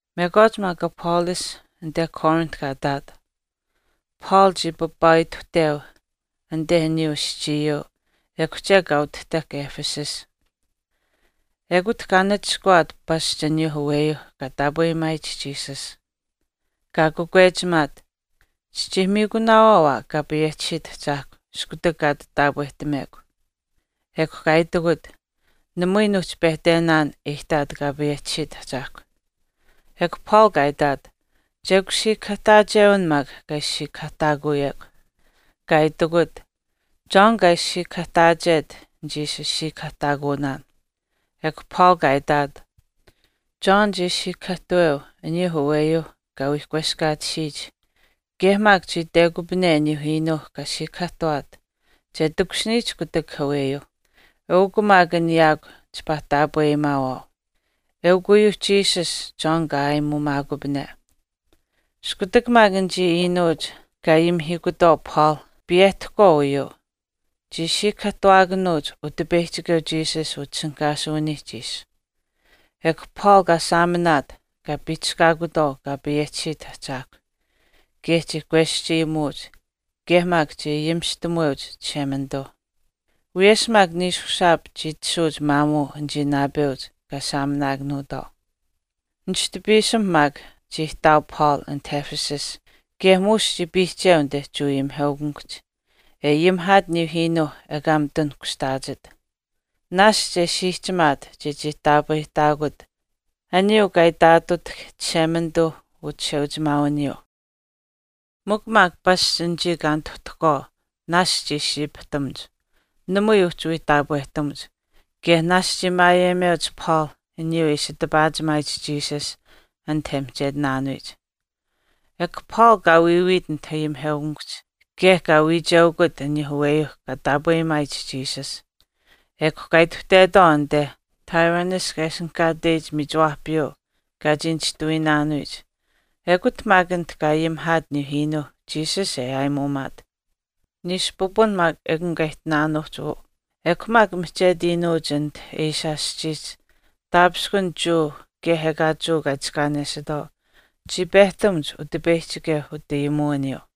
Mekwaach maak Apollos anite Corinth kaa ihtaat, Paul chii papaaituhteu anite aniyuu aschiiyuu ekw chek kaa utahtahk Ephesus. Ekut kaa nachishkawaat pasch aniyuu aweyuuh kaa taapweyimaayich Jesus. Kaa kakwechimaat, “Chichii miikunaawaau aa Kaa payehchisiit Ahchaahkw iskutak kaa ati taapwehtamekw.” Ekw kaa itikut, “Namui nuuhchi pehtenaan e ihtaat Kaa payehchisiit Ahchaahkw.” Ekw Paul kaa itaat, “Chekw siikahaahtaachewin maak kaa ishi siikahaahtaakuyekw.” Kaa itikut, “John kaa ishi siikahaahtaachet nichii ishi siikahaahtaakunaan.” Ekw Paul kaa itaat, “John chii siikahaahtuweu aniyuu aweyuu kaa wii kweskaatisiyich kaye maak chii Itekupane aniyuu iinuu kaa siikahaahtuwaat, che takushiniyich kutak aweyuu. Eukw maak an yaakw chipaa taapweyimaawaau. Ekun uyuu Jesus John kaa aayimuumaakupane.” Iskutak maak anichii iinuuch kaa ayimihiikutwaau Paul piyehtahkwaau uyuu, chii siikahaahtuwaakanuuch Utipeyihchikeu Jesus utishinihkaasuwiniihch ishi. Ekw Paul kaa saaminaat, kaa piihchishkaakutwaau Kaa payehchisiyich Ahchaahkwa, kaye chii kweschayimuuch, kaye maak chii ayimistamuweuch Chishemanituu. Wiyesh maak niishushaap chii tashuuch maamuu anichii naapeuch kaa saaminaakanuutwaau. Nishtu piisim maak chii ihtaau Paul anit Ephesus kaye muush chii piihcheu anite Jewa ayimiheukamikuhch, e ayimihaat aniyuu iinuu ekaa mitun kushtaachit, naashch e siihchimaat chechii taapwehtaakut aniyuu kaa itaatutahk Chishemanituu uchisheuchimaawiniyuu. Mikw maak pasch anichii kaa nituhtahkwaau naashch chii siipihtamuch, namui uhchi wii taapwehtamuch, kaye naashch chii maayeyimeuch Paul aniyuu e ishi tipaachimaayich Jesus anit e mihchetinaanuyich. Ekw Paul kaa wiiwiit anit ayimiheukamikuhch kaye kaa wiicheukut aniyuu aweeyuuh kaa taapweyimaayich Jesus, ekw kaa ituhtetwaau anite Tyrannus kaa ishinihkaateyich miichiwaahpiyuu kaa chii nishtuwiinaanuyich ekut maak anit kaa ayimihaat aniyuu iinuu Jesus e aayimuumaat. Niishu pipun maak ekun kaa ihtinaanuuhch uu, ekw maak mihchetu iinuuch anit Asia aschiihch taapishkun Jewa kaye ekaa Jewa kaa itiskaanesitwaau chii pehtamuch Utipeyihchikeu utayimuwiniyuu.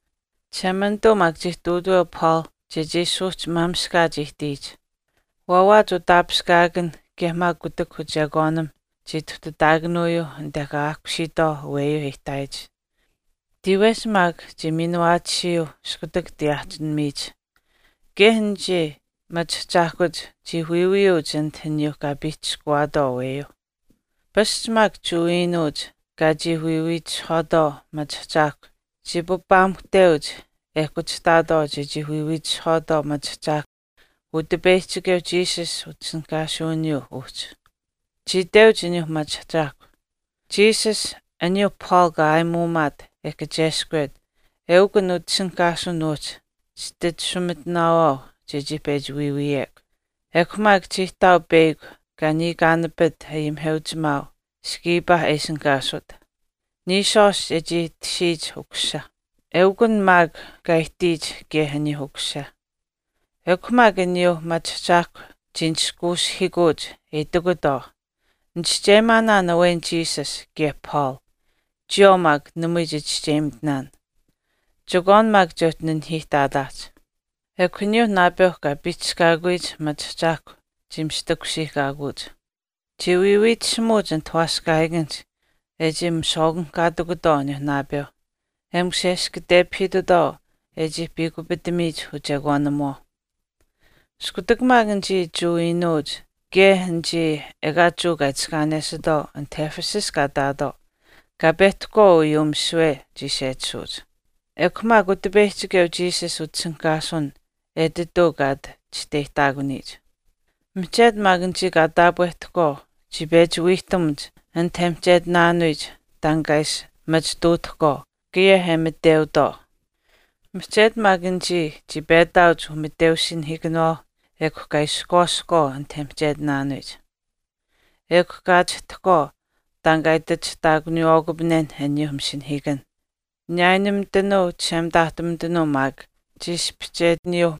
Chishemanituu maak chii ihtuutaweu Paul chechii suuhchimaamishkaach ihtiyich. Waawaach utaapishkaakan kaye maak kutak uchekwaanim chii ituhtataakanuyuuh anite kaa aahkusiitwaau aweyuuh e ihtaayich, tiiwehch maak chii miinuwaatisiyuu iskutak tiyaahichinimiyich. Kaye anichii machiahchaahkuch chii wiiwiyuuch anit aniyuu kaa piihchishkuwaatwaau aweyuu. Pasch maak Jewa iinuuch kaa chii wiiwiitishihwaatwaau machiahchaahkwa chii papaamuhteuch e kuchihtaatwaau chechii wiiwiitishihwaatwaau machiahchaahkwa Utipeyihchikeu Jesus utishinihkaasuwiniyuu uhchi. Chii iteuch aniyuuh machiahchaahkwa, “Jesus, aniyuu Paul kaa aayimuumaat e kacheskwet, eukun an utishinihkaasuwin uhchi chititashumitinaawaau chechii pechi wiiwiyekw.” Ekw maak chii ihtaau peyakw kaa niikaanapit ayimiheuchimaau Sceva e ishinihkaasut, niishwaashch e chii tashiyich ukusisa, eukun maak kaa ihtiyich kaye aniyuu ukusisa. Ekw mikw aniyuu machiahchaahkwa chii nishkuushihiikuuch e itikutwaau, “Nichischeyimaanaan awen Jesus kaye Paul. Chiyawaau maak namui chichischeyimitinaan. Chekwaan maak che uhchi nanihiihtaataahch.” Ekw aniyuuh naapeu kaa piihchishkaakuyich machiahchaahkwa chii mistakusiihkaakuuch. Chii wiiwiitishimuuch anit waaskaahiikanihch e chii miswaakanihkaatikutwaau aniyuuh naapeu, e musheshkatepahiitutwaau e chii piikupitamiyich uchekwaanimuwaau. Iskutak maak anichii Jewa iinuuch kaye anichii ekaa Jewa kaa itiskaanesitwaau anit Ephesus kaa ihtaatwaau kaa pehtahkwaau uyuu misiwe chii sechisuuch, ekw maak Utipeyihchikeu Jesus utishinihkaasuwin etituu kaa ati chisteyihtaakanuyich. Mihchetu maak anichii kaa taapwehtahkwaau chii pechi wiihtamuch anit e mihchetinaanuyich taan kaa ishi machituutahkwaau kaye e miteutwaau. Mihchetu maak anichii chii petaauch umiteusinahiikanawaau ekw kaa ishkwaasahkwaau anit e mihchetinaanuyich. Ekw kaa achihtahkwaau taan kaa itachihtaakuniiwaakupanenh aniyuuh masinahiikanh, niyaayinumitanuu chishemitaahtumitanuu maak chii ispihchetiyuu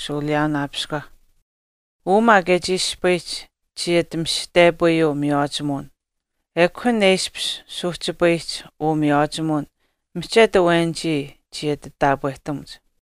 shuuliyaawaapiskwa. Uu maak e chii ispayihch chii ati mishihtepayuu miywaachimuwin, an maak e ishpish suuhchipayihch uu miywaachimuwin mihchetu awenichii chii ati taapwehtamuch.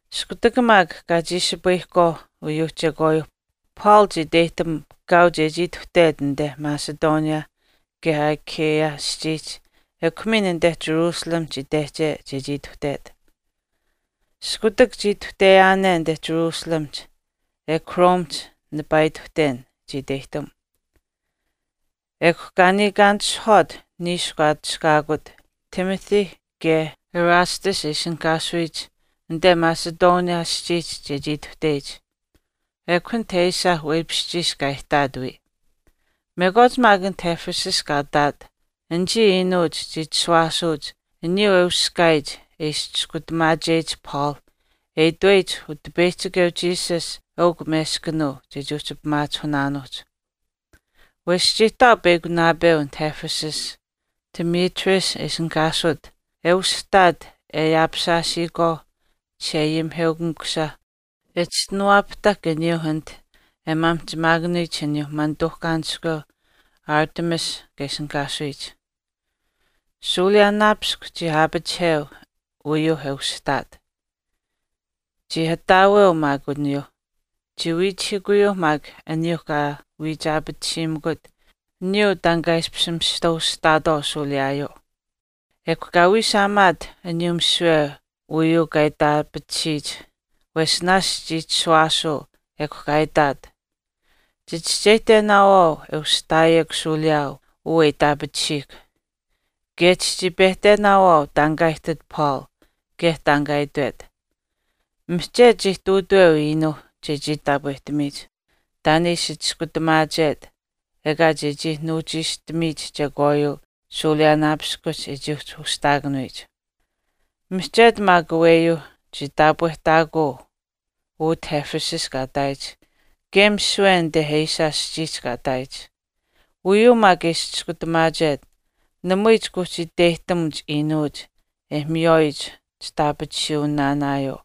Iskutak maak kaa chiishipayihkwaau uyuu chekwaayuu Paul chii iteyihtam kaau chechii ituhtet anite Macedonia kaye Achaia aschiihch ekw miin anite Jerusalemihch itehche chechii ituhtet. “Iskutak chii ituhteyaane anite Jerusalemihch, ekw Romehch nipaa ituhten” chii iteyihtam. Ekw kaa niikaanitishihwaat niishu kaa atushkaakut Timothy kaye Erastus e ishinihkaasuyich anite Macedonia aschiihch chechii ituhteyich, ekw anit Asia weipishchiish kaa ihtaat wiya. Mekwaach maak anit Ephesus kaa ihtaat, anichii iinuuch chii chishuwaasuuch aniyuu e uskaayich e ishi chiskutamaacheyich Paul e itweyich Utipeyihchikeu Jesus eukw meskanuu chechii uhchi pimaachihunaanuuhch. Wesh chii ihtaau peyakw naapeu anit Ephesus, Demetrius e ishinihkaasut e ushihtaat e ayaapishaashiyikwaau chisheayimiheukamikusha e chischinuwaapahtahk aniyuu anite miyaamihchimaakanuyich aniyuu manituuhkaaniskweu Artemis kaa ishinihkaasuyich. Shuuliyaaunaapiskw chii aapachiheu uyuu e ushihtaat. Chii ataaweu maak aniyuuh. Chii wiichihiikuyuu maak aniyuu kaa wiichaapatisiimikut aniyuu taan kaa ishpish chii mista ushihtaatwaau shuuliyaayuu. Ekw kaa wiishaamaat aniyuu misiwe uyuu kaa itaapatisiyich wesh naashch chii chishuwaasuu ekw kaa itaat, “Chichischeyihtenaawaau e ushihtaayihkw shuuliyaau uu e itaapatisiihkw, kaye chichii pehtenaawaau taan kaa ihtit Paul kaye taan kaa itwet. Mihchetu chii ihtuutaweu iinuu chechii taapwehtamiyich taan e ishi chiskutamaachet ekaa chechii nuuchiishtamiyich chekwaayuu shuuliyaanaapiskuhch e chii uhchi ushihtaakanuyich. Mihchetu maak aweyuu chii taapwehtaakuu utah Ephesus kaa ihtaayich kaye misiwe anite Asia aschiihch kaa ihtaayich. Uyuu maak e ishi chiskutamaachet, namui chika uhchi iteyihtamuch iinuuch e miywaayich chitaapatisuwinaanaayuu.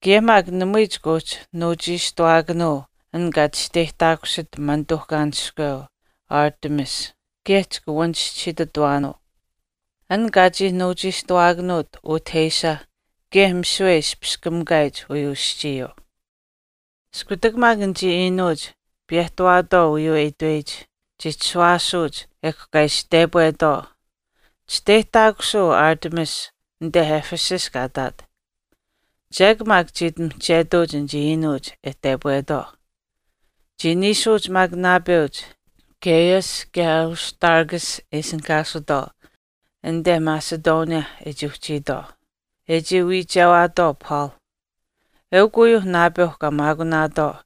Kaye maak namui chika uhchi nuuchiishtuwaakanuu an kaa chisteyihtaakusit manituuhkaaniskweu Artemis kaye chika wanichischisiitutuwaakanuu, an kaa chii nuuchiishtuwaakanuut utah Asia kaye misiwe e ispichiskamikaayich uyuu aschiiyuu.” Iskutak maak anichii iinuuch piyehtawaatwaau uyuu e itweyich chii chishuwaasuuch ekw kaa ishi tepwetwaau, “Chisteyihtaakusuu Artemis anite Ephesus kaa ihtaat.” Chek maak chii ati mihchetuuch anichii iinuuch e tepwetwaau. Chii niishuuch maak naapeuch, Gaius kaye Aristarchus e ishinihkaasutwaau anite Macedonia e chii uhchiitwaau, e chii wiichewaatwaau Paul. Eukw uyuu naapeuh kaa maakunaatwaau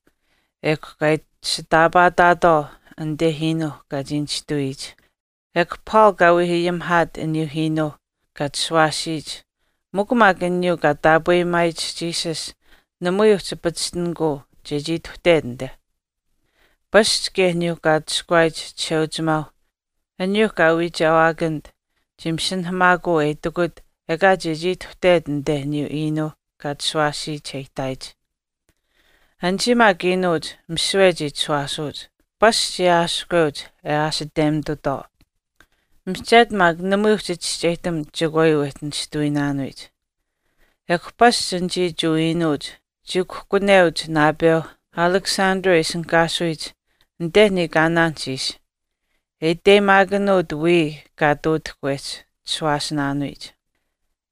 ekw kaa ishitaapaataatwaau anite iinuu kaa chii nishtuwiyich. Ekw Paul kaa wii ayimihaat aniyuu iinuu kaa chishuwaasiyich mikw maak aniyuu kaa taapweyimaayich Jesus namui uhchi pachishtinikuu chechii ituhtet anite. Pasch kaye aniyuu kaa atushkuwaayich chisheuchimaau aniyuuh kaa wiichewaakanit chii masinahamaakuu e itikut ekaa chechii ituhtet anite aniyuu iinuu kaa chishuwaasiyich e ihtaayich. Anichii maak iinuuch misiwe chii chishuwaasuuch, pasch chii aashihkweuch e aashitemitutwaau, mihchetu maak namui uhchi chischeyihtamuch chekwaayuu wehchi nishtuwiinaanuyich. Ekw pasch anichii Jewa iinuuch chii kuhkuneuch naapeu Alexander e ishinihkaasuyich anite niikaanaanihch ishi, e iteyimaakanuut wiya kaa ihtuutahk wehchi chishuwaasinaanuyich.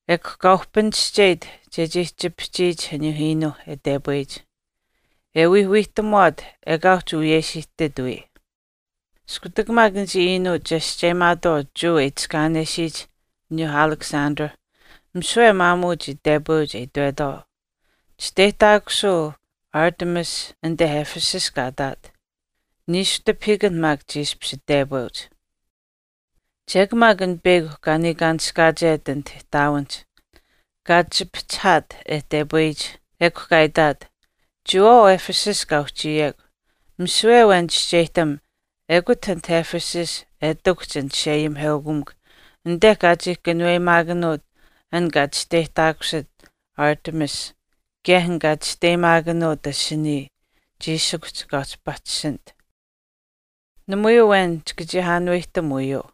Ekw kaa uhpinischeyit chechii chipihchiyich aniyuu iinuu e tepweyich, e wii wiihtamuwaat ekaa uhchi wiyesh ihtit wii. Iskutak maak anichii iinuuch chescheyimaatwaau Jewa e itiskaanesiyich aniyuu Alexander, misiwe maamuu chii tepweuch e itwetwaau, “Chisteyihtaakusuu Artemis anite Ephesus kaa ihtaat.” Niishu tipahiikan maak chii ishpish tepweuch. Chek maak an peyakw kaa niikaanishkaachet anit ihtaawinihch kaa chipihchihaat e tepweyich. Ekw kaa itaat, “Chiyawaau Ephesus kaa uhchiyekw, misiwe awen chischeyihtam ekut anit Ephesus e ihtakuhch an chisheayimiheukamikw anite kaa chii kanuweyimaakanuut an kaa chisteyihtaakusit Artemis kaye an kaa chisteyimaakanuut asinii chiishikuhch kaa uhchi pachishinit. Namui awen chika chii aanuwehtam uyuu.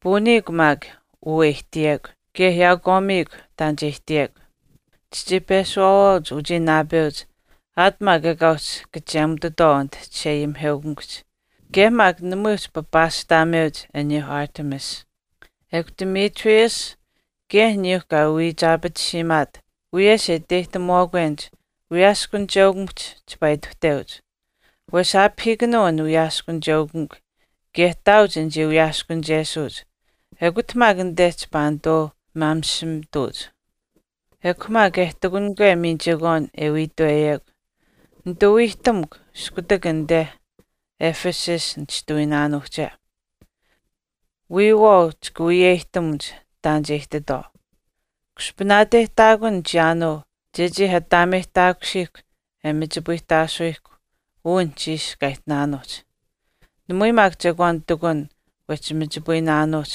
Puuniikw maak uu e ihtiyekw kaye yaakwaamiikw taan che ihtiyekw. Chichii peshuwaawaauch uchii naapeuch aat maak ekaa uhchi kachemutitwaau anit chisheayimiheukamikuhch kaye maak namui uhchi papaashtaameuch aniyuu Artemis. Ekw Demetrius kaye aniyuu kaa wiichaapatisiimaat wiyesh e iteyihtamuwaakwenich wiyaaskunicheukamikuhch chipaa ituhteuch. Wesh aapahiikanuu an wiyaaskunicheukamikw kaye ihtaauch anichii wiyaaskunichesuuch ekut maak anite chipaa nituu mamishimituuch. Ekw maak e ihtakunikwe miin chekwaan e wii itweyekw, nituu wiihtamukw iskutak anite Ephesus nishtuwiinaanuuhche. Wiyawaau chika wiyeyihtamuch taan che ihtitwaau. Kushpanaateyihtaakun chiyaanuu chechii ataameyihtaakusiihkw e machipayihtaasuyihkw uu anuhchiish kaa ihtinaanuuhch. Namui maak chekwaan ihtakun wehchi machipayinaanuuhch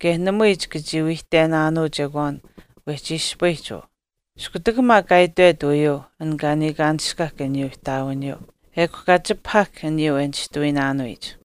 kaye namui chika chii wiihtenaanuu chekwaan wehchi ispayihch uu.” Iskutak maak kaa itwet uyuu an kaa niikaanishkahk aniyuu ihtaawiniyuu, ekw kaa chipahahk aniyuu e nishtuwiinaanuyich.